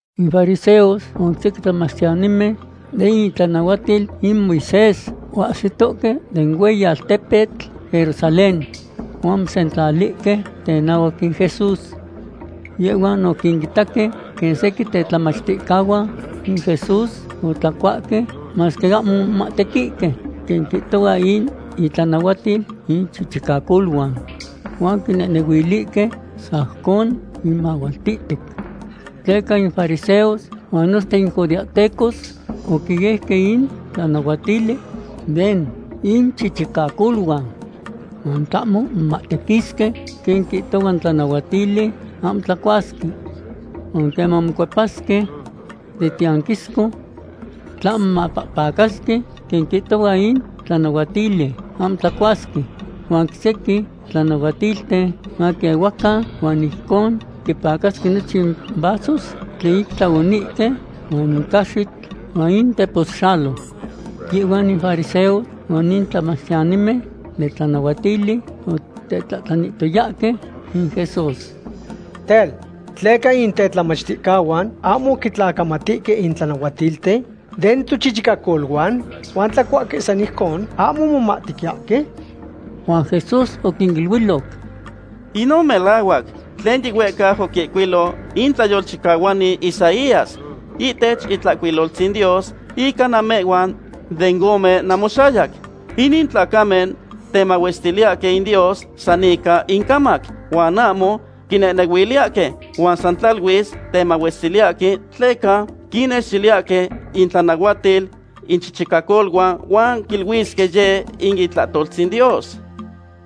In fariseos huan sequin tlamachtiyanimen den itlanahuatil in Moisés oahsitohque den hueyi altepetl Jerusalén, huan omosentlalihque tenahuac in Jesús. Yehhuan oquinitaque quen sequin tetlamachticahuan in Jesús otlacuahque masque ahmo omomahtequihque quen quihtohua in itlanahuatil inchichicacoluan. Huan oquinehnehuilihque sajcon quimahualtihtoc. Tleca in fariseos huan nochten in judeahtecos oquieuque in tlanahuatili den inchichicacoluan huan tlahmo momahtequisque quen quihtohua in tlanahuatili, ahmo tlacuasque. Huan queman mocuepasque den tiyanquisco, tlahmo mopahpacasque quen quihtohua in tlanahuatili, ahmo tlacuasque. Huan oc sequin tlanahuatilten maquiehuacan, huan ijcon quipacasque nochin vasos tlen ic tlaonihque, huan in caxitl, huan in teposxalo. Yehhuan in fariseos huan in tlamachtiyanimen den tlanahuatili otetlahtlanihtoyahque in Jesús: ―Tel, ¿tleca in tetlamachticahuan ahmo quitlacamatihque in tlanahuatilten den tochichicacoluan, huan tlacuahque san ijcon ahmo momahtequiyahque? Huan Jesús oquiniluiloc: ―Inon melahuac tlen yihuehcau oquihcuilo in tlayolchicahuani Isaías ihtech Itlahcuiloltzin Dios ica namehhuan den ome namoxayac: Inin tlacamen temahuestiliyahque in Dios san ica incamac, huan ahmo quinehnehuiliyahque. Huan san tlaluis temahuestiliyahque tleca quinnextiliyahque intlanahuatil inchichicacoluan huan quiluisque yeh in itlahtoltzin Dios.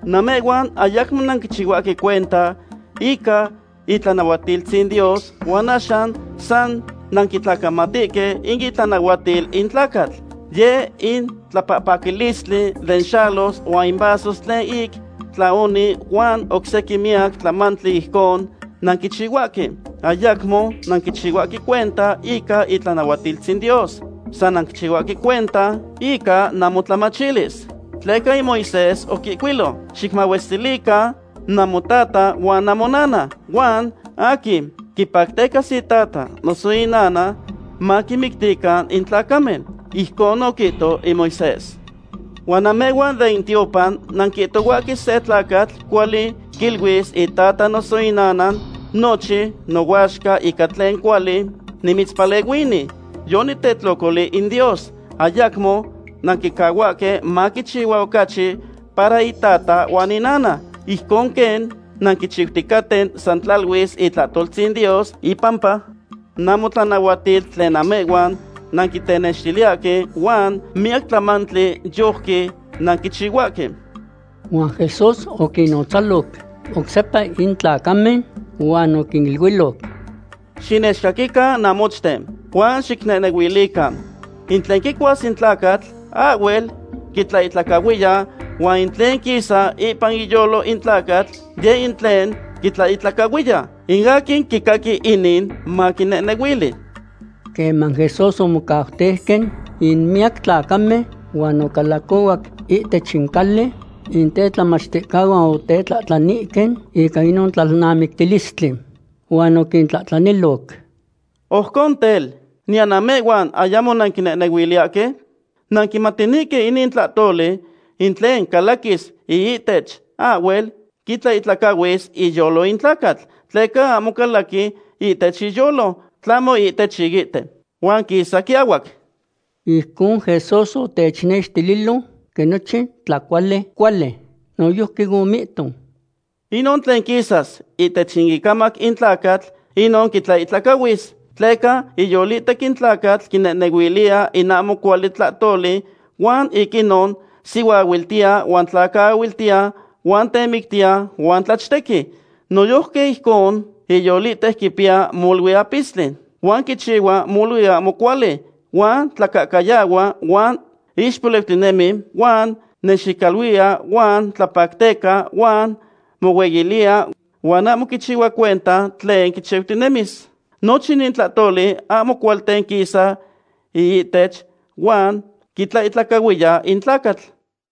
Namehhuan ayacmo nanquichihuahque cuenta ica itlanahuatiltzin Dios huan axan san nanquitlacamatihque in itlanahuatil in tlacatl. Yeh in tlapahpacalistli den xalos huan in vasos tlen ic tlaonihque huan oc sequin miyac tlamantli ijcon nanquichihuahque. ’Ayacmo nanquichihuahque cuenta ica itlanahuatiltzin Dios. San nanquichihuahque cuenta ica namotlamachilis. Tleca in Moisés oquihcuilo: “Xicmahuestilican namotata huan namonana”, huan “Aquin quipactecas itata noso inana, maquimictican in tlacamen.” Ijcon oquihto in Moisés. Huan namehhuan den tiopan nanquihtohuahque se tlacatl cuali quiluis itata noso inana; “Nochin nohuaxca ica tlen cuali nimitzpalehuini, yonitetlocoli in Dios.” Ayacmo nanquicahuahque maquichihua ocachi para itata huan inana. Ijcon quen nanquichiuticaten san tlaluis itlahtoltzin Dios ipampa namotlanahuatil tlen namehhuan nanquitenextiliyahque. Huan miyac tlamantli yojqui nanquichihuahque. Huan Jesús oquinnotzaloc oc sepa in tlacamen, huan oquiniluiloc: ―Xinechcaquican namochten, huan xicnehnehuilican. In tlen quicuas in tlacatl ahhuel quitlaihtlacahuiya, huan in tlen quisa ipan iyolo in tlacatl, yeh in tlen quitlaihtlacahuiya. In aquin quicaqui inin, maquinehnehuili. Queman Jesús omocauteuque in miyac tlacamen huan ocalacohuac ihtech in cali, in tetlamachticahuan otetlahtlanihque ica inon tlalnamictilistli. Huan oquintlahtlaniloc: ―Ojcon tel, ¿niyan namehhuan ayamo nanquinehnehuiliyahque? Nanquimatinihque inin tlahtoli. In tlen calaquis iihtech ahhuel quitlaihtlacahuis iyolo in tlacatl. Tleca ahmo calaqui ihtech iyolo, tlahmo ihtech iihte, huan quisa quiahuac. Ijcon Jesús otechnextililo quen nochin tlacuali cuali. Noyojqui omihto: ―Inon tlen quisas ihtech in icamac in tlacatl, inon quitlaihtlacahuis. Tleca iyolihtec in tlacatl quinehnehuiliya in ahmo cuali tlahtoli huan ic inon sihuaahuiltiya huan tlacaahuiltiya huan temictiya huan tlachtequi. Noyojqui ijcon iyolihtec quipiya molui apistli, huan quichihua molui ahmo cuali, huan tlacahcayahua huan ixpoliucatinemi huan nexicaluiya huan tlapacteca huan mohueyiliya huan ahmo quichihua cuenta tlen quichiutinemis. Nochin inin tlahtoli ahmo cualten quisa iihtech huan quitlaihtlacahuiya in tlacatl.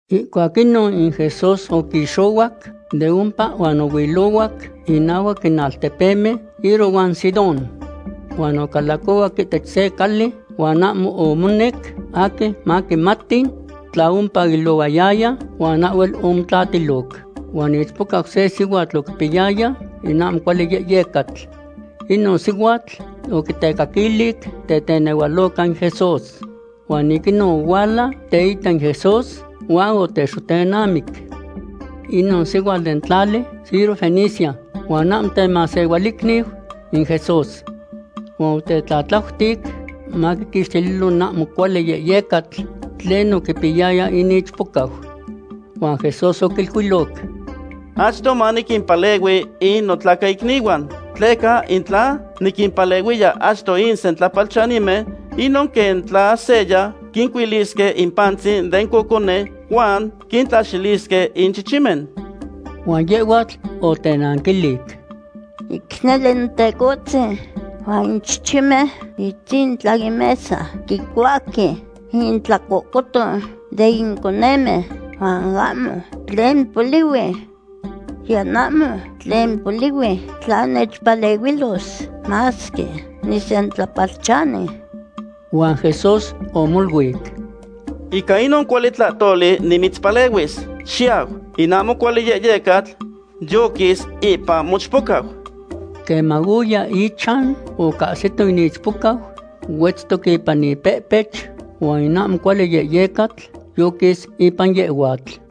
Ihcuac inon in Jesús oquixohuac de ompa huan ohuilohuac inahuac in altepemen Tiro huan Sidón. Huan ocalacohuac ihtech se cali huan ahmo omonec aquin maquimati tla ompa oilohuaya, huan ahhuel omotlatiloc. Huan ichpocau se sihuatl oquipiyaya in ahmo cuali yehyecatl. Inon sihuatl oquitecaquilic tetenehualoca in Jesús. Huan ic inon ohuala teita in Jesús huan otexotenamic. Inon sihuatl den tlali Sirofenicia huan ahmo temasehualicniu in Jesús. Huan otetlatlautic maquiquixtililo in ahmo cuali yehyecatl tlen oquipiyaya in ichpocau. Huan Jesús oquiluiloc: ―Achto maniquimpalehui in notlacaicnihuan, tleca in tla niquimpalehuiya achto in sentlapalchanimen, inon quen tla seya quincuilisque in pantzin den cocone huan quintlaxilisque in chichimen. Huan yehhuatl otenanquilic: ―Ic nele Notecohtzin, huan in chichimen itzintla in mesa quicuahque intlahtlacoton den conemen huan ahmo tlen polihui. Niyan ahmo tlen polihui tla nechpalehuilos, masque nisentlapalchani. Huan Jesús omoluic: ―Ica inon cuali tlahtoli nimitzpalehuis. Xiyau; in ahmo cuali yehyecatl yoquis ipan mochpocau. Queman oya ichan ocahsito in ichpocau huetztoc ipan ipehpech huan in ahmo cuali yehyecatl yoquis ipan yehhuatl.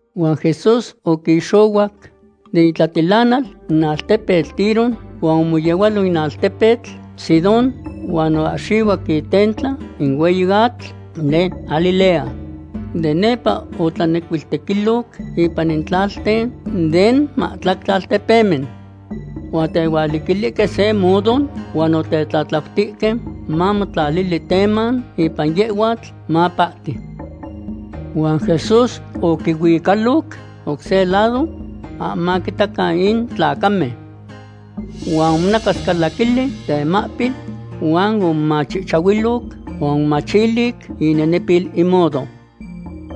Huan Jesús oquixohuac den itlatilanal in altpetl Tiro, huan omoyehualo in altepetl Sidón huan oahxihuac itentla in hueyi atl den Galilea. De nepa otlanecuiltequiloc ipan in tlalten den mahtlactli altepemen. Huan otehualiquilihque se mudo, huan otetlatlautihque mamotlali teman ipan yehhuatl, mapahti. Huan Jesús oquihuicaloc oc se lado ahmo maquitacan in tlacamen. Huan omonacascalaquili temahpil huan omomachihchahuiloc huan omomachilic inenepil in mudo.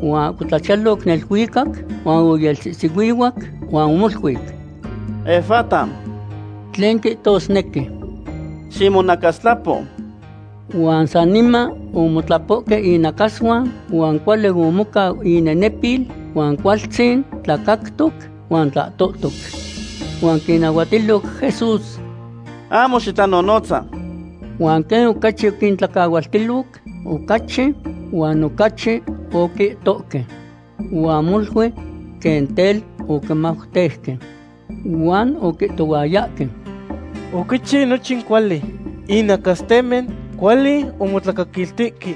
Huan oahcotlachiyaloc neluicac, huan oyelsihsihuihuac huan omoluic: ―¡Efata!, tlen quihtosnequi, ximonacastlapo. Huan saniman omotlapohque inacasuan huan cuali omocau inenepil, huan cualtzin tlacactoc huan tlahtohtoc. Huan oquinnahuatiloc Jesús: ―¡Ahmo xitlanonotza! Huan quen ocachi oquintlacahualtiloc, ocachi huan ocachi oquihtohque. Huan molui quen tel oquimauteuque huan oquihtohuayahque: ―Oquichiu nochin cuali; in nacastemen cuali omotlacaquiltihque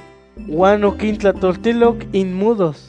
huan oquintlahtoltiloc in mudos.